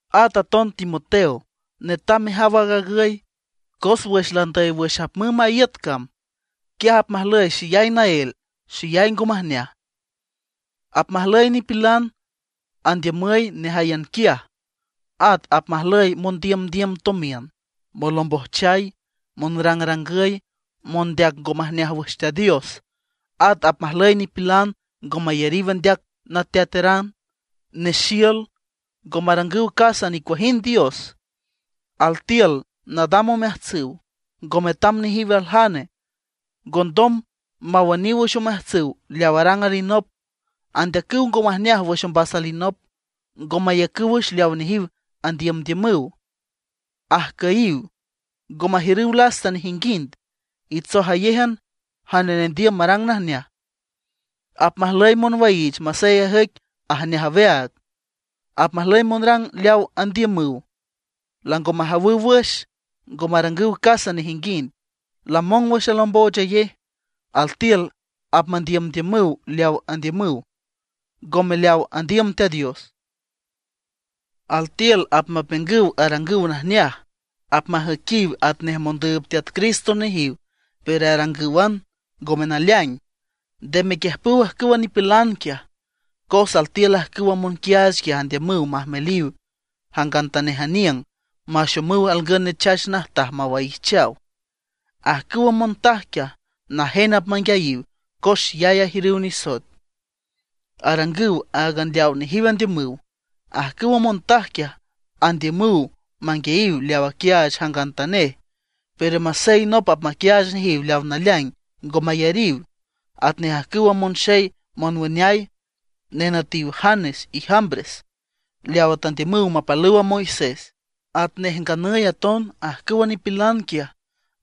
At aton Timoteo, netam mejaw aag agüy, cos wüx landüy wüx apmümb aaga iüt cam, quiaj apmajlüy xeyay naél, xeyay ngo majneaj. Apmajlüy nipilan andiümüy nejáyan quiaj, at apmajlüy mondiümdiüm tomiün, monlombojchay, monrangrangüy, mondeac ngo majneaj wüx Teat Dios. At apmajlüy nipilan ngo mayariw andeac nateataran, nexiül, ngo marangüw casa nicuajind dios. Altiül nadam omeajtsüw, ngo metam nejiw aljane. Ngondom mawüniw wüx omeajtsüw leaw arang alinop. Andeacüw ngo majneaj wüx ombas alinop. Ngo maiücüw wüx leaw nejiw andiümdiümüw. Ajcüyiw, ngo majiürüw lasta nejinguind. Itsojayéjan jane nendiüm marang najneaj. Apmajlüy monwaiich masey ajüic ajneaj aweaag. Apmajlüy monrang leaw andiümüw, lango majawüw wüx; ngo marangüw casa nejinguind, lamong wüx alomboochayej. Altiül apmandiümdiümüw leaw andiümüw, ngome leaw andiüm Teat Dios. Altiül apmapiüngüw arangüw najneaj, apmajüiquiw atnej mondüüb Teat Cristo nejiw pero arangǘwan, ngome naleaing. Nde mequiüjpüw ajcüwa nipilan quiaj. Cos altiül ajcüwa monquiaach quiaj andiümüw majmeliw jangantanej aniüng, maxomüw alngün nechach najtaj mawaijchaw. Ajcüwa montaj quiaj najen apmanguiayiw cos xeyay ajiürüw nisoet, arangüw áagan leawa nejiw andiümüw. Ajcüwa montaj quiaj andiümüw manguiayiw leaw aquiaach jangantanej; pero masey nop apmaquiaach nejiw leaw naleaing, ngo mayariw. Atnej ajcüwa monxey monwüneay, nenütiw Janes y Jambres, leawa tandiümüw mapalüw a Moisés; atnej nganüy aton ajcüwa nipilan quiaj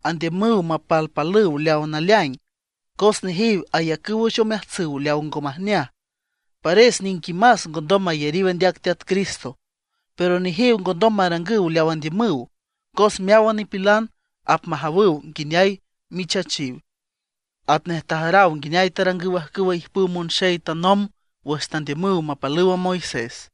andiümüw mapalpalüw leaw naleaing. Cos nejiw ayacüw wüx omeajtsüw leaw ngo majneaj, pares niquimas ngondom mayariw andeac Teat Cristo. Pero nejiw ngondom marangüw leaw andiümüw, cos meáwan nipilan apmajawüw nguineay michachiw, atnej tajaraw nguineay tarangüw ajcüwa ijpüw monxey tanomb wüx tandiümüw mapalüw a Moisés.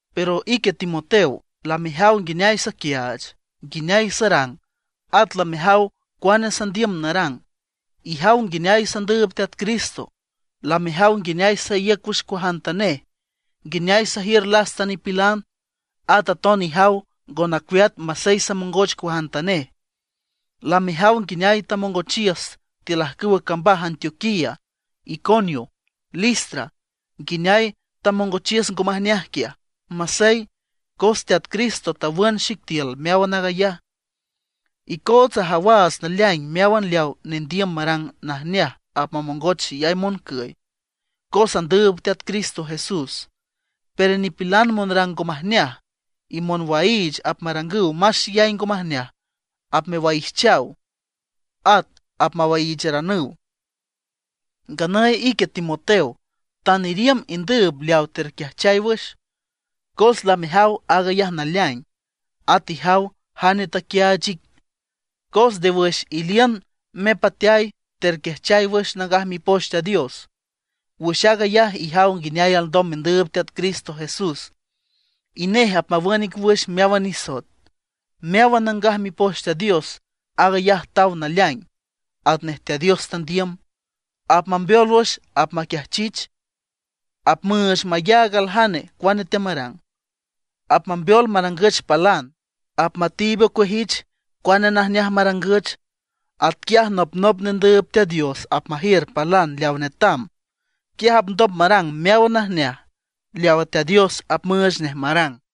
Pero ique Timoteo, lamejaw nguineay saquiaach, nguineay sarang. At lamejaw cuane sandiüm narang, ijaw nguineay sandüüb Teat Cristo. Lamejaw nguineay saíüc wüx cuajantanej, nguineay sajiür lasta nipilan; at aton ijaw ngo nacueat masey samongoch cuajantanej. Lamejaw nguineay tamongochiüs tiül ajcüwa cambaj Antioquía, Iconio, Listra, nguineay tamongochiüs ngo majneaj quiaj. Masey, cos Teat Cristo tawün xic tiül meáwan aag ayaj. Icootsa ajawaats naleaing meáwan leawa nendiüm marang najneaj apmamongoch xeyay moncüy, cos andüüb Teat Cristo Jesús. Pero nipilan monrang ngo majneaj, y monwaiich apmarangüw más xeyay ngo majneaj, apmewaijchaw, at apmawaiicharanüw. Nganüy ique Timoteo, tan iriümb indüüb leawa terquiajchay wüx, cos lamejaw aag ayaj naleaing; at ijaw jane taquiaach ic. Cos nde wüx iliün mepateay terquiajchay wüx Nangaj Mipoch Teat Dios. Wüx aag ayaj ijaw nguineay alndom mendüüb Teat Cristo Jesús, y nej apmawün ic wüx meáwan nisoet. Meáwan Nangaj Mipoch Teat Dios, aag ayaj taw naleaing atnej Teat Dios tandiüm. Apmambeol wüx apmaquiajchich, apmüüch mayaag aljane cuane teamarang, apmambeol marangüch palan, apmatiib ocueajich cuane najneaj marangüch. Atquiaj nopnop nendüüb Teat Dios apmajiür palan leawa netam, quiaj apndom marang meáwan najneaj leawa Teat Dios apmüüch nej marang.